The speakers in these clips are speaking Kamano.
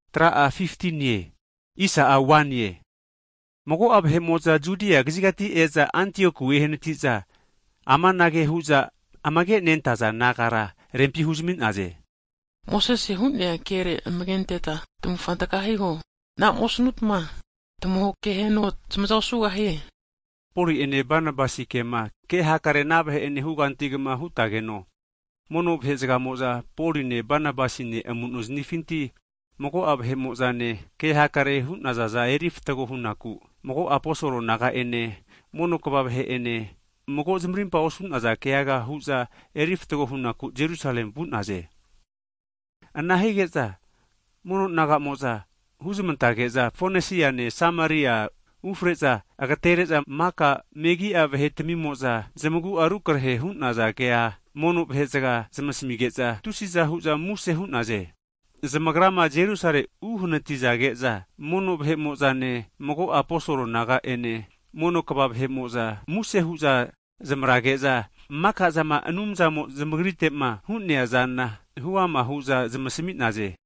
Hagi mago'a vahe'mo'za Judia kazigati e'za Antioku ehanati'za amanage hu'za zamentinti nehu'za amage' nentaza nagara rempi huzami'naze. Mosese hu'nea kere amage' antetma tamavufa taga hiho. Anama osanutma Anumzamo'a tamahokeno tamaza osugahie. Poli'ene Banabasi kema ke hakare ana vahe'enema hugantigama hutageno, mono vahe zagamo'za Poline Banabasine amu'no zamifinti mago'a vahe'mo'zane kehakare hu'nazaza eri fatgo hunaku mago'a, aposol naga'ene mono kva vahe'ene (eldas) mago zamarimpa osu'naza keaga huza eri fatgo hunaku Jerusalemi vu'naze. Ana hige'za mono naga'mo'za, huzamantege'za, Fonesiane Sameria ufare'za agatere'za maka megi'a vahe'tamimo'za zamagu'a rukarehe hu'naza kea mono vahe'zaga zamasmige'za tusi'za hu'za muse hu'naze. Zamagrama Jerusalemi uhanatizage'za, mono vahe'mo'zane, mago'a aposol naga'ene mono kva vahe'mo'za (eldas) muse hu'za zamavrage'za, maka'zama Anumzamo'ma zamagrite'ma hu'neazana huama hu'za zamasmi'naze.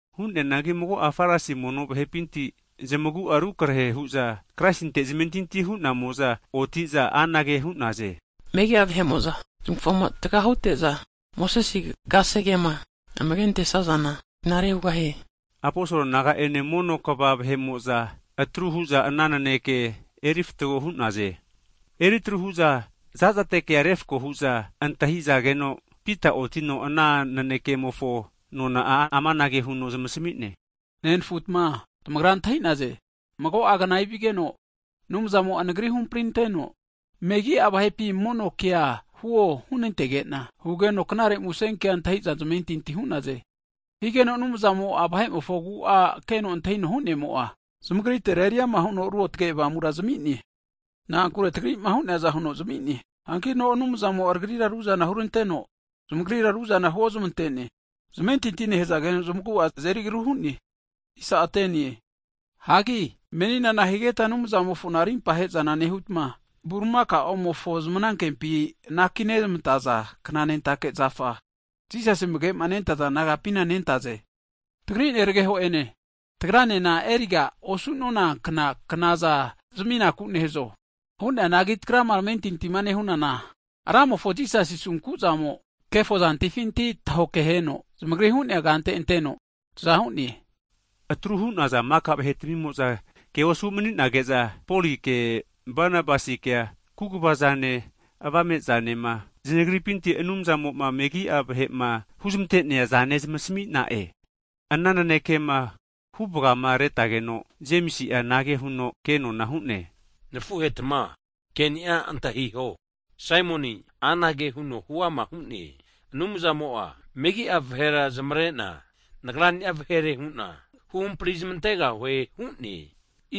Hu'neanagi mago'a Farisi mono vahepinti, zamagua rukarehe hu'za Kraisinte zamentinti hu'namo'za, oti'za anage hu'naze, megi'a vahe'mo'za zamufama taga hute'za Mosesi kasegema amage antesazana knare hugahie. Aposol naga'ene mono kva (eldas) vahe'mo'za atru hu'za ana naneke erifatgo hu'naze. Eri atru hu'za zazate kea refako hu'za antahizageno, Pita otino ana nanekemofo nona'a amanage huno zamasmi'ne, Nenfutma, tamagra antahi'naze mago'a kna evigeno, Anumzamo'a nagri huhamprinanteno, megi'a vahepi mono kea huo huno hunantege'na, hugeno knare musen ke antahi'za zamentinti hu'naze. Higeno Anumzamo vahe'mofo agu'a keno antahino hu'nemo'a, zamagritera eriama huno Ruotge Avamura zami'ne, na'ankure tagri'ma hu'neazana huno zami'ne. Hankino tagrira Anumzamo'a ruzana huranteno, zamagrira ruzana huozmante'ne, zamentinti nehazageno zamagu'a zamazeri agru hu'ne. Hagi menina nahigetma Anumzamofona rimpa he'zana nehutma, bulimakaomofo zamanankempi anaki nezmantaza kna knanentake agare namare zafa (Yoke) Jisasi amage nentaza disaipol nagapina nentaze. Tagri nerageho'ene, tagranena eriga osu'nonankna knazana zaminaku nehazo? Hu'neanagi tagrama tamentintima nehunana, Ramofo Jisasi asunku'zamo kefo zantifinti tahoke heno zamagri hu'nea kante anteno taza hu'ne. Atru hu'naza maka vahetamimo'za, ke osu mani'nage'za, Polike Banabasikea kaguva'zane avame'zanema zanagripinti Anumzamo'ma megi'a vahe'ma huzmante'nea zana zamasmi'na'e. Ana nanekema huvagamaretageno, Jemisi'a anage huno kenona hu'ne, Nafuhetma ke'ni'a antahiho, Saimoni'a anage huno huama hu'ne, Anumzamo'a megi'a vahera zamare'na Nagra'ni'a vahere hu'na huhampri zamantegahue hu'ne.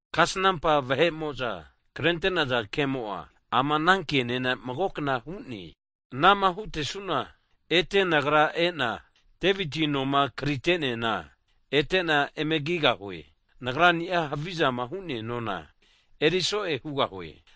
Kasnampa vahe'mo'za krente'naza kemo'a, ama kenena mago kna hu'ne, Anama hutesu'na, ete Nagra e'na Deviti noma karite'neana etena eme kigahue. Nagra'ni'a havizama hu'nea nona eriso'e hugahue.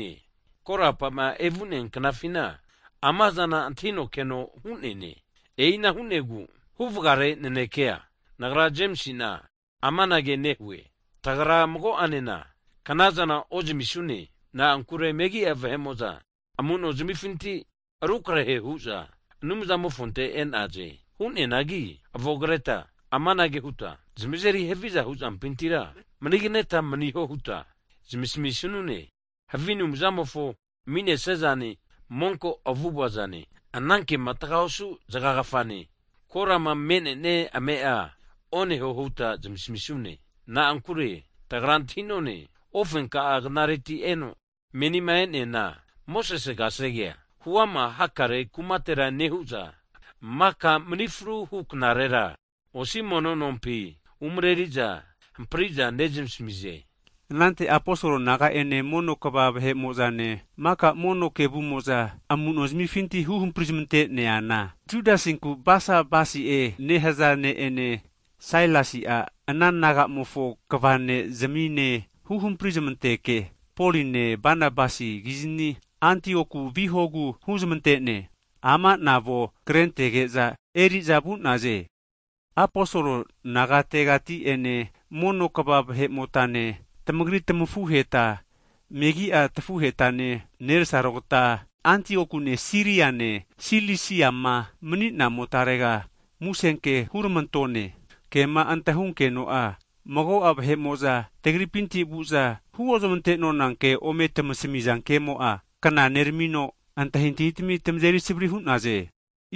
Hagi Korapa'ma evu'nea knafina amazana antahino keno Anumzamo'a hu'neane. E'ina hu'negu, huvagare nanekea nagra (Jemisi'na) amanage nehue, tagra mago'anena knazana ozamisune, na'ankure megi'a vahe'mo'za amu'no zamifinti rukarehe hu'za Anumzamofonte e'naze. Hu'neanagi avonkreta amanage huta zamazeri haviza huzampintira maniganeta maniho huta zamasmi sanune. Havi anumzamofo ami'nesia zane, monko avu'ava'zane, anankema taga osu zagagafane, korama me'ne'nia ame'a oneho huta zamasmisune. Na'ankure tagra antahi'none, ofenka'a knareti eno menima e'neana, Mosese kasege'a huama hakare kumatera nehu'za, maka mani fruhu knarera (Sabat) osi mono (sinagog) nompi umareri'za hampri'za nezamasmize. Anante aposol naga'ene, mono kva vahe'mo'zane, maka mono kevumo'za amuno zamifinti huhampri zamante'nazana Judasinku Basabasi nehaza ne'ene Sailasi'a ana naga'amofo kva ne' zamine huhampri zananteke, Poline Banabasikizni Antioku vihogu huzmante'naze. Ama'na avonkrentage'za eri'za vu'naze, aposol nagategati'ene mono kva vahe'motane, tamagri tamafuheta megi'a tafuhetane nerasarogta Antiokune Siriane, Silisiama mani'namotarega musenke huramantone. Kema antahunkeno'a, mago'a vahe'mo'za tagripinti vu'za, huozmante'nona ke ome tamasmiza kemo'a, kna neramino antahintahitamia tamazeri savari hu'naze.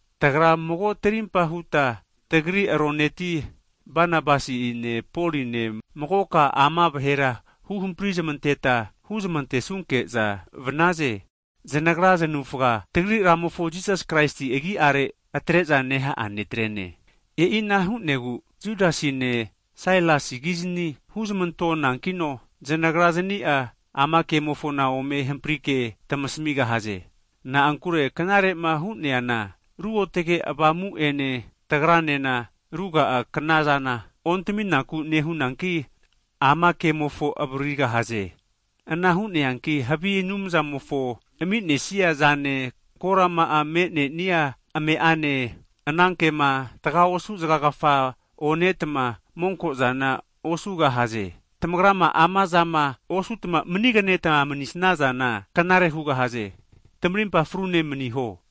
Tagra mago tarimpa huta tavesima nezanantona tagri roneti Banabasine Poline magoka ama vahera huhampri zamanteta huzamantonke'za vaze. Zanagra zanavufa tagri Ramofo Jisasi Kraisi agi'are atre'za neha'a netre'ne. E'ina hu'negu Judasine Sailasikizni huzmantonankino, zanagra zani'a ama kemofona ome hamprike tamasmigahaze. Na'ankure knare'ma hu'neana, Ruotge Avamu'ene tagranena, ruga'a knazana ontaminaku nehunanki, ama kemofo avaririgahaze. Ana hu'neanki havi anumzamofo ami'nesia zane korama'a me'nenia ame'ane, anankema tagaosu zagagafa onetma monko'zana osugahaze. Tamagrama amazama osutma maniganeta manisazana knare hugahaze. Tamarimpa frune maniho.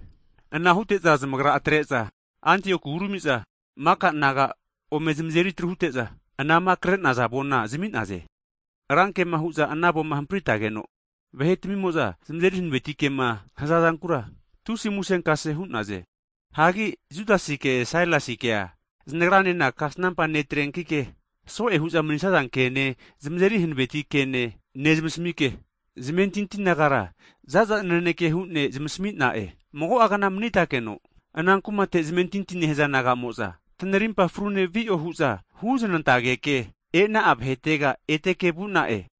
Ana hute'za zamagra atre'za Antioku urami'za, maka naga ome zamazeri atru hute'za anama kre'naza avona zami'naze. Rankema hu'za ana avoma hampritageno, vahe'tamimo'za zamazeri hanaveti kema hazazankura, tusi'a musenkase hu'naze. Hagi Judasike Sailasikea znagranena kasanampa netrenkike, so'e hu'za mani'saza kene zamazeri hanaveti ke nezmasmike, zamentinti nagara zaza naneke hu'ne zamasmi'na'e. Mago'agna manitakeno, ana kumate zamentinti nehaza naga'mo'za, tanarimpa farune vi'o hu'za huznantageke, e'na'a vahetega eteke vu'na'e.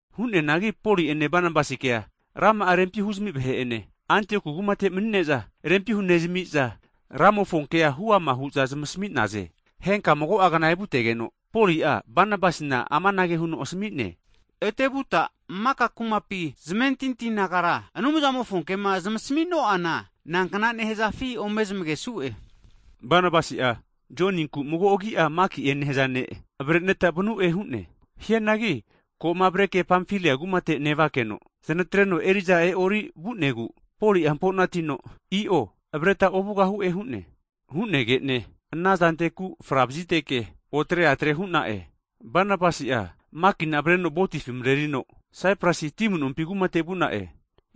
Hu'neanagi Poli'ene Banabasikea, rama'a rempi huzami vahe'ene Antioku kumate mani'ne'za rempi hunezami'za Ramofonkea huama hu'za zamasmi'naze. Henka'a mago'a kna evutegeno, Poli'a Banabasina amanage huno asami'ne, Ete vuta maka kumapi zamentinti nagara, Anumzamofo kema zamasmi'no'ana, nankna nehazafi ome zamagesu'e. Banabasi'a, Joninku mago agi'a Maki'e nehaza ne' avare'neta vanu'e hu'ne. Hianagi ko'ma avareke Pamfili'a kumate nevakeno, zanatreno eri'za e'o'ri vu'negu Poli'a hamponatino i'o, avareta ovugahu'e hu'ne. Hu'nege'ne anazanteku fra vaziteke, otare atre hu'na'e. Banabasi'a Makina avareno votifi marerino Saiprusi ti amunompi kumate vu'na'e.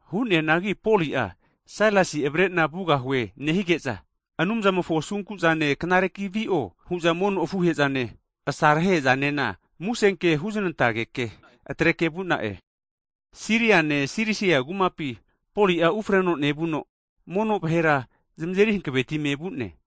Hu'neanagi Poli'a Sailasi avarena vugahue nehige'za, Anumzamofo asunku'zane knare vi'o hu'za mono afuhe'zane asarahehe'zanena musen ke huznantageke atreke vu'na'e. Siriane Silisi'a kumapi Poli'a ufreno nevuno, mono vahera zamazeri hanavetime vu'ne.